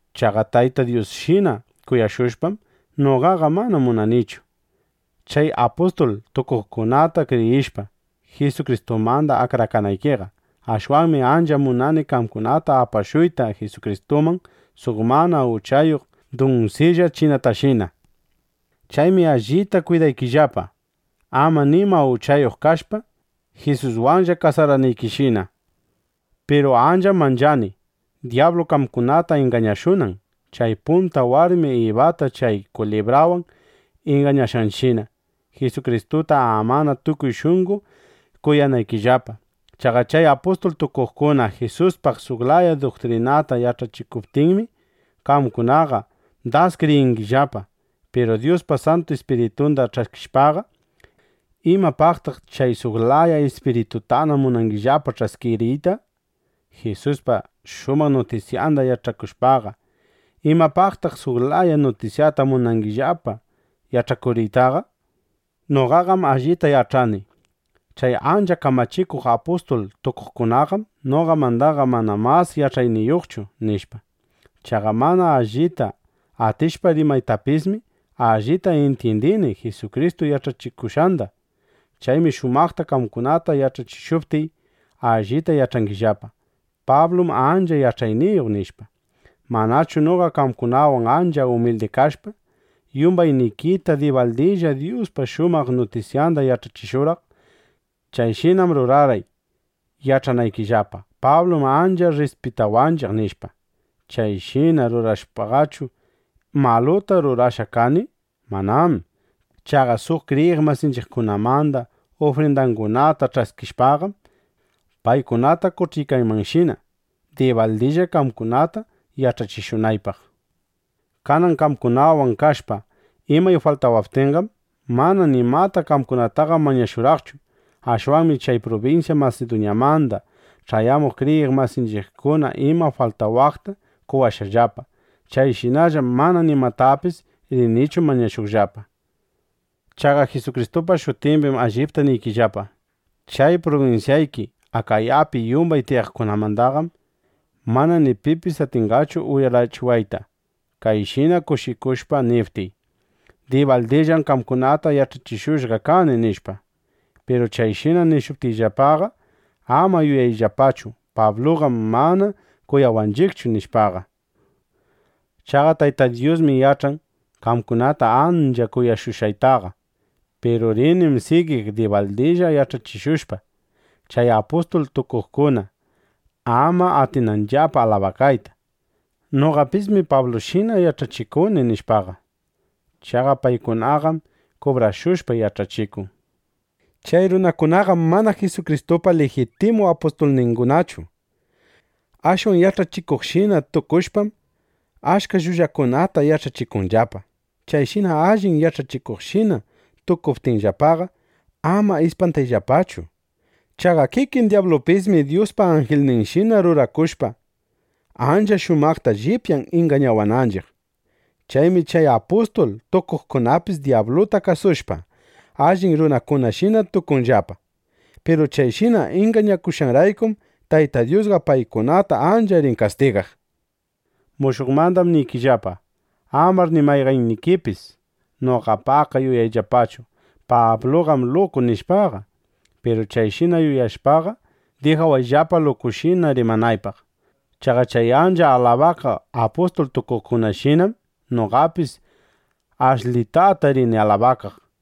Chaqa Tayta Dyusshina kuyashushpam, noqaqa mana munanichu, chay apustul tukuqkunata kriyishpa, Jisukristumanda akrakanaykiqa. Ashwanmi ancha munani qamkunata apashuyta Jisukristuman suq mana uchayuq dunsilla chinatashina. Chaymi allita kwidaykillapa, ama nima uchayuq kashpa, Jisuswanlla kasaranaykishina. Piru ancham manchani, dyablu qamkunata ingañashunan, chay punta warmi Ibata chay kulibrawan ingañashqanshina, Jisukristuta amana tukuy shunqo kuyanaykillapa. Chaqa chay apustul tukuqkuna Jisuspaq suq laya duktrinata yach'achishuptinmi, qamkunaqa das kriyingillapa. Piru Dyuspa Santu Ispiritunda ch'askishpaqa, ¿imapaqtaq chay suq laya ispiritutana munangillapa ch'askiriyta? Jisuspa shumaq nutisyanda yach'akushpaqa, ¿imapaqtaq suq laya nutisyata munangillapa yach'akuriytaqa? Noqaqam allita yach'ani: Chay ancha kamachikuq apustul tukuqkunaqam noqamandaqa mana mas yach'ayniyuqchu, nishpa. Chaqa mana allita atishpa rimaytapismi, allita intyindini Jisukristu yach'achikushqanda. Chaymi shumaqta qamkunata yach'achishuptiy, allita yach'angillapa: Pablum ancha yach'ayniyuq, nishpa. Manchu noqa qamkunawan ancha umildi kashpa, yumbaynikita dibaldilla Dyuspa shumaq nutisyanda yach'achishurqaq. Chayshinam rurarqay, yach'anaykillapa: Pablum ancha rrispitawanchiq, nishpa. Chayshina rurashpaqachu, ¿maluta rurashqa kani? Manám. Chaqa suq kriyiq masinchiqkunamanda ufrindangunata ch'askishpaqam, paykunata qoch'iykaymanshina, dibaldilla qamkunata yach'achishunaypaq. Kanan qamkunawan kashpa imay faltawaptinqam, mana nimata qamkunataqa mañashurqaqchu. Ashwanmi chay prubinsya Masiduñamanda ch'ayamuq kriyiq masinchiqkuna ima faltawaqta qowashqallapa. Chayshinallam mana nimatapis rinichu mañashuqllapa. Chaqa Jisukristupa shutimbim allipta niykillapa: Chay prubinsyayki Akayapi yumbay tiyaqmandaqam mana ni pipis atinqachu uyarachiwayta, kayshina kushikushpa niptiy: “Dibaldillam qamkunata yach'achishushqa kani”, nishpa. Piru chayshina nishuptiyllapaqa, ama yuyayllapachu: Pabluqam mana kuyawanchiqchu, nishpaqa. Chaqa Tayta Dyusmi yach'an, qamkunata ancha kuyashushqaytaqa. Piru rinim sigiq dibaldilla yach'achishushpa, chay apustul tukuqkuna ama atinanllapa alabakayta: “Noqapismi Pablushina yach'achikuni”, nishpaqa. (Chaqa paykunaqam kubrashushpa yach'achikun.) Chay runakunaqam mana Jisukristupa lijitimu apustulningunachu. Ashwan yach'achikuqshina tukushpam, achka llullakunata yach'achikunllapa. Chayshina allin yach'achikuqshina tukuptinllapaqa, ama ispantayllapachu. Chaqa kikin dyablupismi Dyuspa anjilninshina rurakushpa, ancha shumaqta llipyan ingañawananchiq. Chaymi chay apustul tukuqkunapis dyabluta kasushpa, allin runakunashina tukunllapa. Piru chayshina ingañashqanraykum, Tayta Dyusqa paykunata ancha rin kastigaq. Mushuqmandam niriykillapa: Amar ni mayqannikipis noqapaqqa yuyayllapachu: Pabluqam luku, nishpaqa. Piru chayshina yuyashpaqa, dijawayllapa lukushina rimanaypaq. Chaqa chay ancha alabakaq apustul tukuqkunashinam noqapis ashlitata rini alabakaq.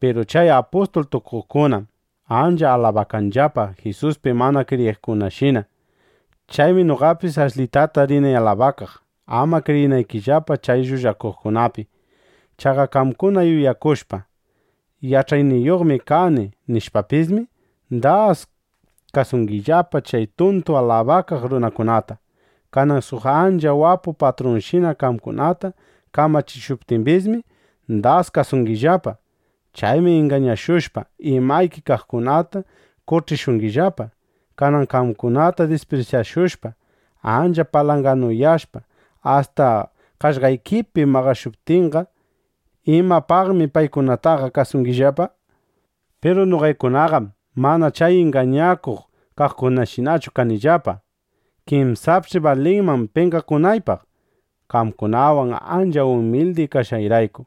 Piru chay apustul tukuqkunam ancha alabakanllapa Jisuspi mana kriyiqkunashina. Chaymi noqapis ashlitata rini alabakaq (ama kriyinaykillapa chay llullakuqkunapi). Chaqa qamkuna yuyashpa: Yach'ayniyuqmi kani, nishpapismi, das kasungillapa chay tuntu alabakaq runakunata. Kanan suq ancha wapu patrunshina qamkunata kamachishuptimbismi, das kasungillapa. Chaymi ingañashushpa, imayki kaqkunata qoch'ishungillapa. Kanan qamkunata disprisyashushpa, ancha palanganuyashpa, asta qaqllaykipi maqashuptinqa, ¿imapaqmi paykunataqa kasungillapa? Piru noqaykunaqam mana chay ingañakuq kaqkunashinachu kanillapa. ¡Kinsapch'i balinman penqakunaypaq, qamkunawan ancha umildi kashqayrayku!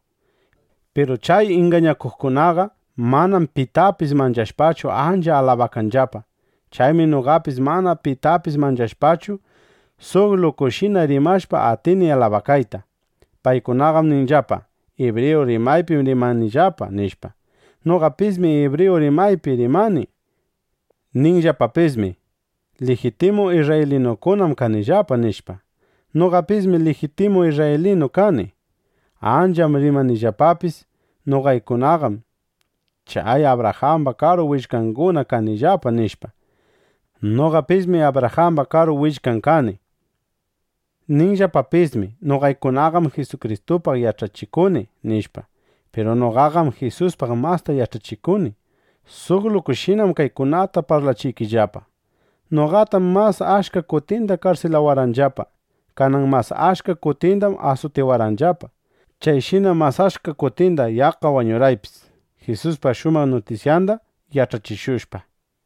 Piru chay ingañakuqkunaqa manam pitapis manchashpachu, ancha alabakanllapa. Chaymi noqapis, mana pitapis manchashpachu, suq lukushina rimashpa, atini alabakayta. Paykunaqam ninllapa: “Ibriyu rimaypim rimanillapa”, nishpa. Noqapismi ibriyu rimaypi rimani. Ninllapapismi: “Lijitimu isrraylinukunam kanillapa”, nishpa. Noqapismi lijitimu isrraylinu kani. Ancham rimanllapapis: “Noqaykunaqam chay Abrajamba karu willkanguna kanillapa”, nishpa. Noqapismi Abrajamba karu willkan kani. Ninllapapismi: “Noqaykunaqam Jisukristupaq yach'achikuni”, nishpa. Piru noqaqam Jisuspaq masta yach'achikuni. Suq lukushinam kaykunata parlachiykillapa. Noqatam mas achka kutinda karsilawarqanllapa. Kanan mas achka kutindam asutiwarqanllapa. Chayshinam mas achka kutinda yaqqa wañurqanipis, (Jisuspa shumaq nutisyanda yach'achikushpa.)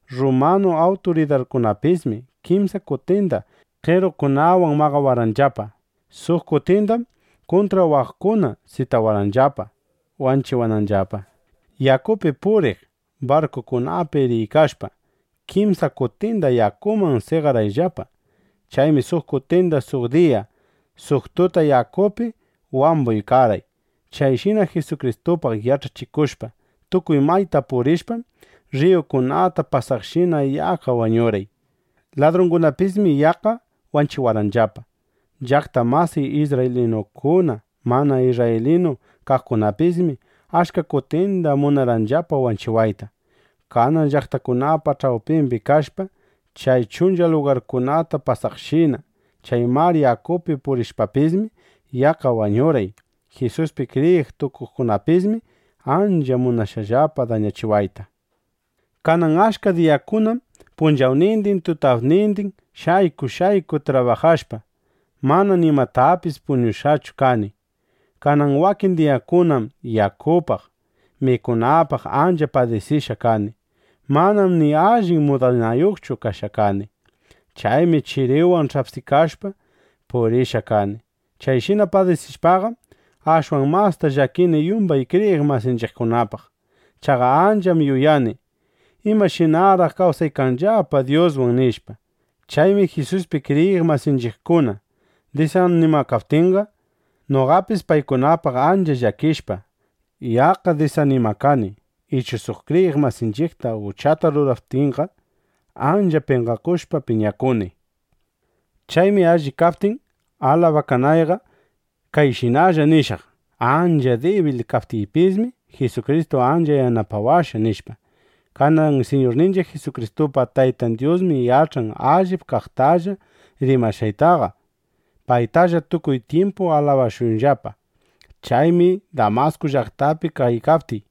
(Rrumanu awturidarkunapismi) kimsa kutinda qerukunawan maqawarqanllapa. Suq kutindam kuntrawaqkuna sitawarqanllapa, wanchiwananllapa. Yakupi puriq barkukunapi riykashpa, kimsa kutinda yakuman seqarqayllapa. Chaymi suq kutinda suq diya, suq tuta yakupi wambuykarqay. Chayshina Jisukristupaq yach'achikushpa, tukuy mayta purishpam, rriyukunata pasaqshina yaqqa wañurqay. Ladrungunapismi yaqqa wanchiwarqanllapa. Llaqta masiy isrraylinukuna, mana isrraylinu kaqkunapismi achka kutinda munarqanllapa wanchiwayta. Kanan llaqtakunapa ch'awpimbi kashpa, chay chuncha lugarkunata pasaqshina, chay mar yakupi purishpapismi, yaqqa wañurqay. Jisuspi kriyiq tukuqkunapismi ancha munashqallapa dañachiwayta. Kanan achka diyakunam punchawnindin tutapnindin shayku shayku trabajashpa, mana nimatapis puñushqachu kani. Kanan wakin diyakunam yakupaq, mikunapaq ancha padisishqa kani. Manam ni allin mudanayuqchu kashqa kani. Chaymi chiriwan ch'apsikashpa purishqa kani. Chayshina padisishpaqam, ashwan masta llakini yumbay kriyiq masinchiqkunapaq. Chaqa ancham yuyani: ¿Imashinaraq kawsaykanllapa Dyuswan? nishpa. Chaymi Jisuspi kriyiq masinchiqkuna disanimakaptinqa, noqapis paykunapaq ancha llakishpa, yaqqa disanimakani. Ichu suq kriyiq masinchiqta uchata rurachiptinqa, ancha penqakushpa, piñakuni. Chaymi alli kaptin alabakanayqa, kayshinalla nishaq: Ancha dibil kaptiypismi, Jisukristu ancha yanapawashqa, nishpa. Kanan Siñurninchiq Jisukristupa Taytan Dyusmi yach'an allip kaqtalla rimashqaytaqa. ¡Paytalla tukuy tyimpu alabashunllapa! Chaymi Damasku llaqtapi kaykaptiy,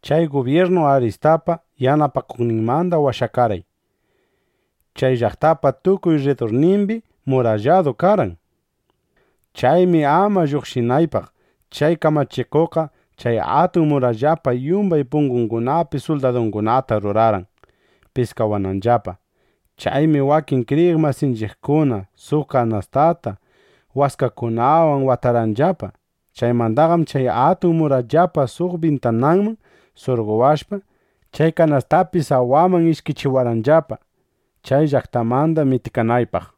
chay gubyirnu Aritaspa yanapakuqninmanda washawarqan. Chay llaqtapa tukuy rridurninmi muralladu karqan. Chaymi ama lluqshinaypaq, chay kamachikuqqa chay atun murallapa yumbay pungungunapi suldadungunata rurarqan, piskawananllapa. Chaymi wakin kriyiq masinchiqkuna suq kanastata waskakunawan watarqanllapa. Chaymandaqam chay atun murallapa suq bintananman surqowashpa, chay kanastapi sawaman ishkichiwarqanllapa, chay llaqtamanda mitikanaypaq.